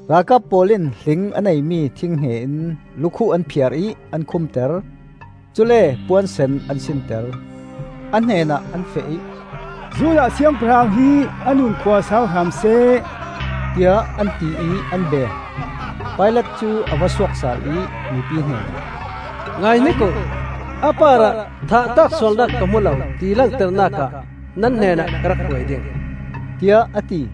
Ralkap pawl in hling a neimi thinghnge in lukhuh an phiar ih an khumter. Cule puan sen an sinter. A hnenah an feh ih, “Judah Siangpahrang hi a nunkhua sau hram seh,” tiah an ti ih an beng. Pilat cu a va suak sal ih mipi hnenah, “Ngaihnik uh! A parah thah tlak sualnak ka hmu lo, ti langternak ah nan hnenah ka rak hruai ding,” tiah a ti.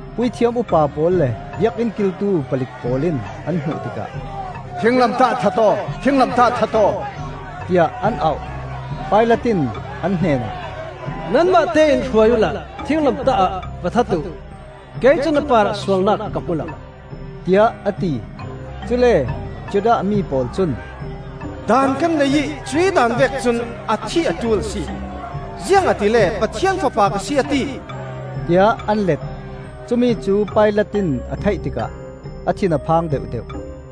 Puithiam upa pawl le Biakinn kiltu palik pawl in an hmuh tikah, “Thinglamtah ah that aw! Thinglamtah ah that aw,” tiah an auh. Pilat in an hnenah, “Nanmahte in hruai uhla thinglamtah ah va that uh! Kei cun a parah sualnak ka hmu lo,” tiah a ti. Cule Judah mi pawl cun, “Daan kan nei ih cuih daan vek cun a thih a ṭul a si, ziangahtile Pathian Fapa ka si a ti,” tiah an let. Cumi cu Pilat in a theih tikah a thin a phang deuhdeuh.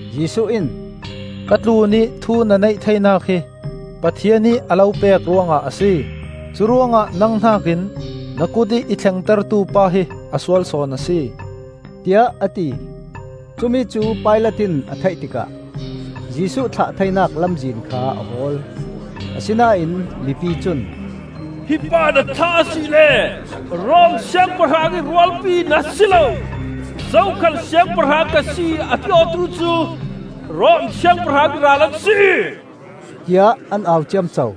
Jesuh in, “Ka tlunih thu na neih theinak hi Pathian ih a lo pek ruangah a si. Curuangah nang hnakin na kutih i thlengtertu pa hi a sual sawn a si,” tiah a ti. Cumi cu Pilat in a theih tikah Jesuh thlah theinak lamzin kha a hawl. Asinain mipi cun, “Hi pa na thlah asile Rom Siangpahrang ih rualpi na si lo. Zokhal Siangpahrang ka si a ti awtu cu Rom Siangpahrang ih ral an si,” tiah an au ciamco.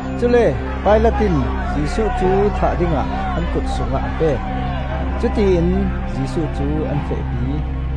Cule Pilat in Jesuh cu thah dingah an kut sungah a pek. Cutiin Jesuh cu an fehpi.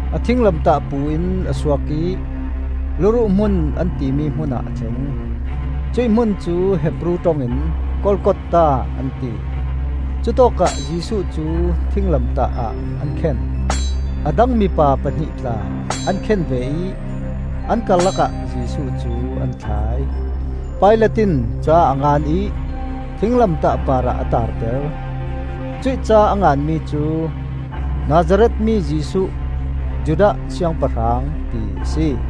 A thinglamtah pu in a suak ih “Luruh Hmun,” an timi hmunah a thleng. Cuih hmun cu Hebru ṭong in “Golgotha,” an ti. Cutawkah Jesuh cu thinglamtah ah an khen. A dang mipa pahnih tla an khen ve ih an karlak ah Jesuh cu an thlai. Pilat in ca a ngan ih thinglamtah parah a taarter. Cuih ca a nganmi cu, “Nazareth mi Jesuh, Judah Siangpahrang,” ti a si.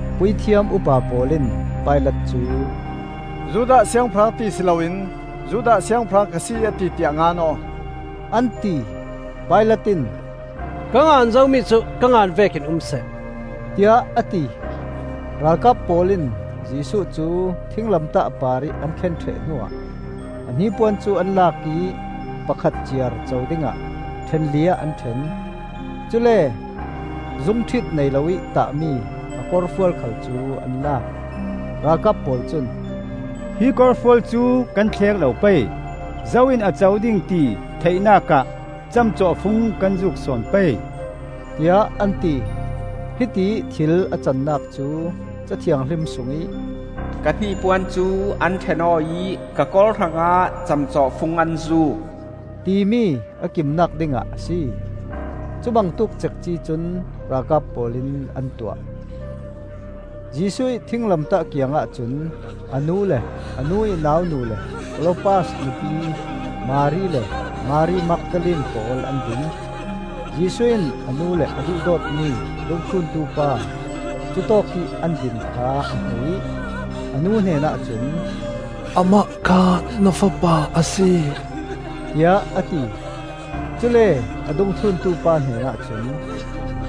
Puithiam upa pawl in Pilat cu, “‘Judah Siangpahrang,’ ti si loin ‘Judah Siangpahrang ka si, a ti,’ tiah ngan aw,” an ti. Pilat in, “Ka ngan zomi cu ka ngan vekin um seh,” tiah a ti. Ralkap pawl in Jesuh cu thinglamtah parih an khen ṭheh hnuah a hnipuan cu an lak ih pakhat ciar co dingah ṭhen li ah an ṭhen. Cule zungṭhit nei lo ih tahmi a korfual khal cu an lak. Ralkap pawl cun, “Hi korfual cu kan thlek lo pei. Zo in a co ding ti theihnak ah camcawhfung kan zuk sawn pei,” tiah an ti. Hitiih thil a cannak cu Ca Thianghlim sungih, “Ka hnipuan cu an ṭhen aw ih, Ka kor hrangah camcawhfung an zuk,” timi a kimnak dingah a si. Cubangtuk cekci cun ralkap pawl in an tuah. Jesuh ih thinglamtah kiangah cun a nu le a nu ih naunu le Klopas nupi Mari le Mari Magdalene pawl an ding. Jesuh in a nu le a duhdawtmi dungthluntu pa cutawkih an din kha a hmu ih a nu hnenah cun, “Amah kha na fapa a si,” tiah a ti. Cule a dungthluntu pa hnenah cun,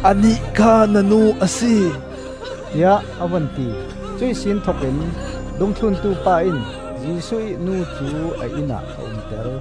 “Anih kha na nu a si,” tiah a vun ti. Cuihsin thokin dungthluntu pa in Jesuh ih nu cu a innah a umter.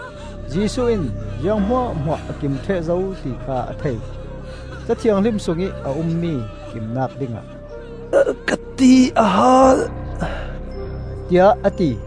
Jesuh in ziang hmuahhmuah a kim ṭheh zo ti kha a thei; Ca Thianghlim sungih a ummi kimnak dingah, “Ka ti a haal,” tiah a ti.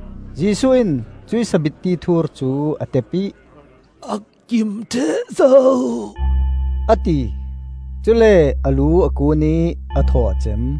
Jesuh in cuih sabitti thur cu a tep ih, “A kim ṭheh zo,” a ti. Cule a lu a kuun ih a thaw a cem.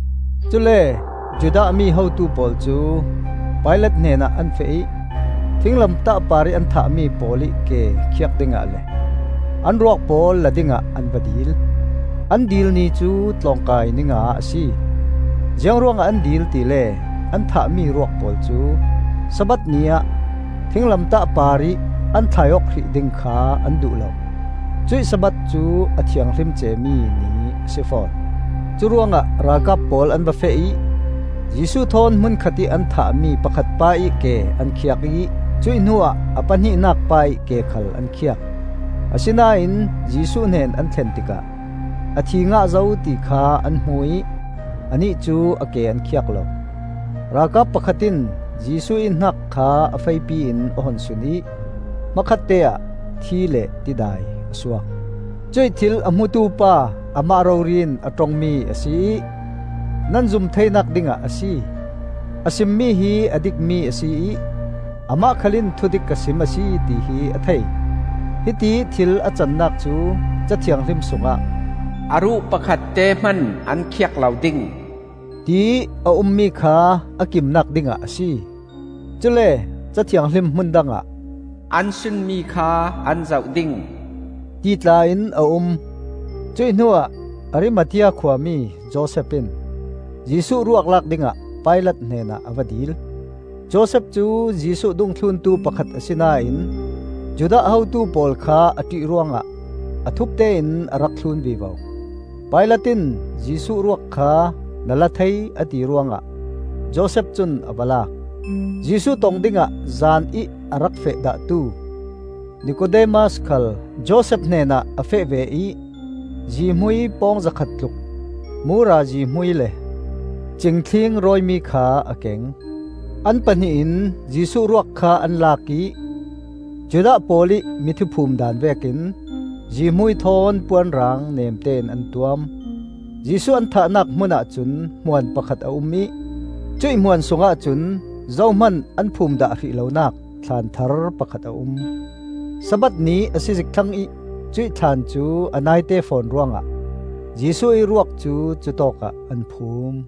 Cule Judah mi hotu pawl cu Pilat hnenah an feh ih thinglamtah parih an thahmi pawl ih ke khiak dingah le an ruak pawl la dingah an va dil. An dil ni cu Tlawngkai Ninga a si, ziang ruangah an dil tile an thahmi ruak pawl cu Sabbath ni-ah thinglamtah parih an thlai awk hrih ding kha an duh lo; cuih Sabbath cu a thianghlim cemi ni a si fawn. Curuangah ralkap pawl an va feh ih Jesuh thawn hmunkhatih an thahmi pakhat pa ih ke an khiak ih cuih hnuah a pahnihnak pa ih ke khal an khiak. Asinain Jesuh hnen an thlen tikah a thi ngah zo ti kha an hmu ih anih cu a ke an khiak lo. Ralkap pakhat in Jesuh ih hnak kha a feipi in a hun sun ih hmakhatte ah thi le tidai a suak. Cuih thil a hmutu pa amah rori in a ṭongmi a si ih nan zum theinak dingah a si. A simmi hi a dikmi a si ih amah khal in thudik ka sim a si ti hi a thei. Hitiih thil a cannak cu Ca Thianghlim sungah, “A ruh pakhatte hman an khiak lo ding,” tiih a ummi kha a kimnak dingah a si. Cule Ca Thianghlim hmun dangah, “An sunmi kha an zoh ding,” ti tla in a um. Cuih hnuah Arimathea khuami Josef in Jesuh ruak lak dingah Pilat hnenah a va dil. Josef cu Jesuh dungthluntu pakhat asinain Judah hotu pawl kha a ṭih ruangah a thupte in a rak thlun vivo. Pilat in Jesuh ruak kha na la thei, a ti ruangah Josef cun a va lak. Jesuh tong dingah zanih a rak feh dahtu Nikodemas khal Josef hnenah a feh ve ih zihmui pawng zakhat tluk, mura zihmui le cing thling rawimi kha a keng. An pahnih in Jesuh ruak kha an lak ih Judah pawl ih mithi phum daan vekin zihmui thawn puanrang nemtein an tuam. Jesuh an thahnak hmunah cun hmuan pakhat a um ih cuih hmuan sungah cun zohman an phum dah hrih lonak thlaan thar pakhat a um. Sabbath ni a si zik thlang ih cuih thlaan cu a naite fawn ruangah Jesuh ih ruak cu cutawkah an phum.